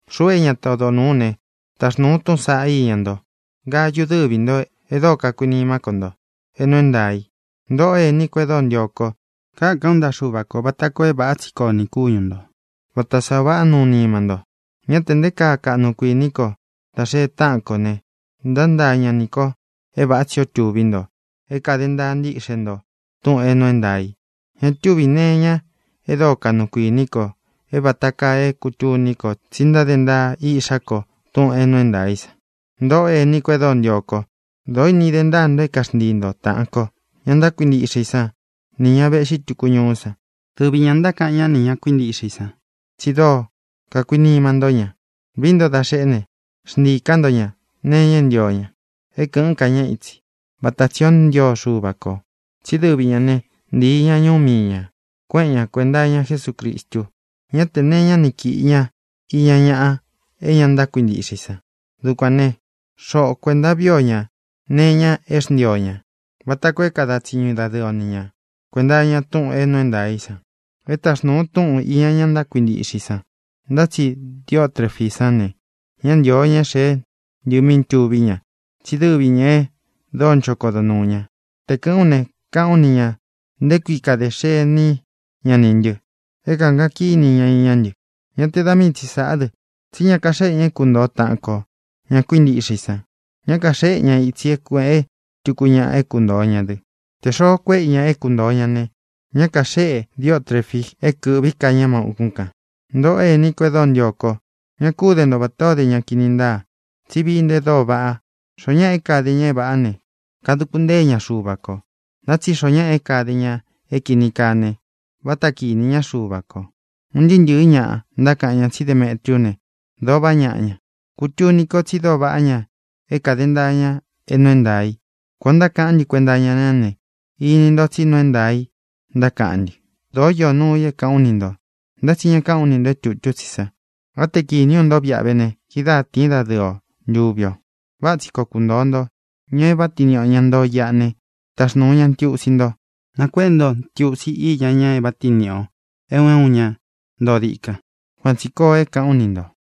Xuꞌu é ñata odo nūú u ne, taxnūu u túꞌūn saꞌá iña nto, Gayu, dɨ́vi ntō e dóo kakuinimá ko nto é nuu é ntaā i. Ntōꞌó ení ko e dóo ntio kó, kakan ú ntaꞌa Xuva kō vata koo é vāꞌá tsi koo nī kúñu ntō, vata sá ō vaꞌá nuu nima nto. Ñá tē nté kaa kaꞌnu kuiní ko dá xee táꞌan kō ne, ntántaa ña nī ko é vāꞌá tsi ō tuví nto é kāde ntaa ntíꞌxe nto túꞌūn é nuu é ntaā i. Ña túvī nee iña e dóo kaꞌnu kuiní ko é vāta kaa é kūtuni ko tsi ntáde ntaa iꞌxá ko túꞌūn é nuu é ntaā í san. Ntōꞌó ení ko e dóo ntio kó, dōó ini de ntáa nto é kaxntii nto taꞌan kō, ña ntákuintiꞌxe i sán, nī ña véꞌxi tūku ñuú san. Dɨvi ñā ntákaꞌan ñá nī ña kuintiꞌxe i san tsi dóo kakuinima ntó ña. Vií nto da xeꞌe ne, xntiī ká nto ña nee iña é ntio ña é kɨ̄ꞌɨn ká ña itsi, vata tsī ó ntio Xuva kō. Tsí dɨvi ñā né, ntīi ña ñuú mii ñā, kuéꞌen ñā kuenta iña Jesúcristu. Ñá tē nee iñá ni kīꞌi ña iña ñaꞌa é ña ntákuintiꞌxe i san. Dukuān né, xoꞌo kuēnta vií o ñā nee iña é xntii o ñā, vata koo é kada tsiñu dadɨɨ o ni ña kuēnta iña túꞌūn é nuu é ntaā í san. E táxnūu u túꞌun īña ña ntákuintiꞌxe i san. Ntá tsi Diotrefí san ne, ñá ntīo ña é xēé ntɨ mí tuví ña, tsí dɨvi ñā e dóo ncho kodo nuū ña. Te kɨ̄ꞌɨ́n u ne, káꞌān ú ni ñā nté kui kade xení ña nī ntɨ é kākaꞌan kíni ña iñá ntɨ. Ñá te da mii tsi sāꞌá dɨ, tsí ña kaxéꞌe ña é kuntōo taꞌan ko, ña kuíntiꞌxe i san. Ña kaxéꞌe ña itsī é kuēꞌe túku ñaꞌa é kuntōo ña dɨ. Tē xoo kuéꞌe i ña é kuntōo ña ne, ña kaxéꞌe Diotrefi é kɨ̄ꞌví ka ña má ūkún kān. Ntōꞌó ení ko e dóo ntio ko, ña kú de nto vatā ó de ña kini ntáa, tsi vií nto e dóo vaꞌa. Xoó ñaꞌa é kāde ña é vāꞌá ne, kaduku ntée ña Xuva kō. Ntá tsi xoo ñáꞌa é kāde ña é kīni kaa ne, vata kinī ñá Xuva kō. Un ntɨɨ́ ntɨ̄ɨ́ ñaꞌa ntákaꞌan ña tsí Demetriú ne, dōo vaꞌá ñaꞌa ña. Kutuni ko tsi dóo vaꞌá ña é kāde ntaa ña é nuu é ntaā i. Kuān o ntákaꞌán ntɨ kuenta iña ñá ne, ini nto tsí nuu é ntaā i ntákaꞌán ntɨ. Dōó īó nuu i é kāꞌán u ni ntō, ntá tsi ñá kāꞌán u ni ntō é tutu tsí sa. Á te kīní u nto viꞌa ve ne, kidáa tīín dadɨɨ o ntuvi ō. Váꞌa tsi koo kuntōo nto. Ña é vāꞌá tiin niꞌi ō, ña ntoo iꞌa ne, taxnūu ña ntiusi nto. Nakuéꞌe nto ntiusi iña ña é vāꞌá tiin niꞌi ō, é un é un ña ntoo dikan. Kuan tsī koo é kāꞌán u ni ntō.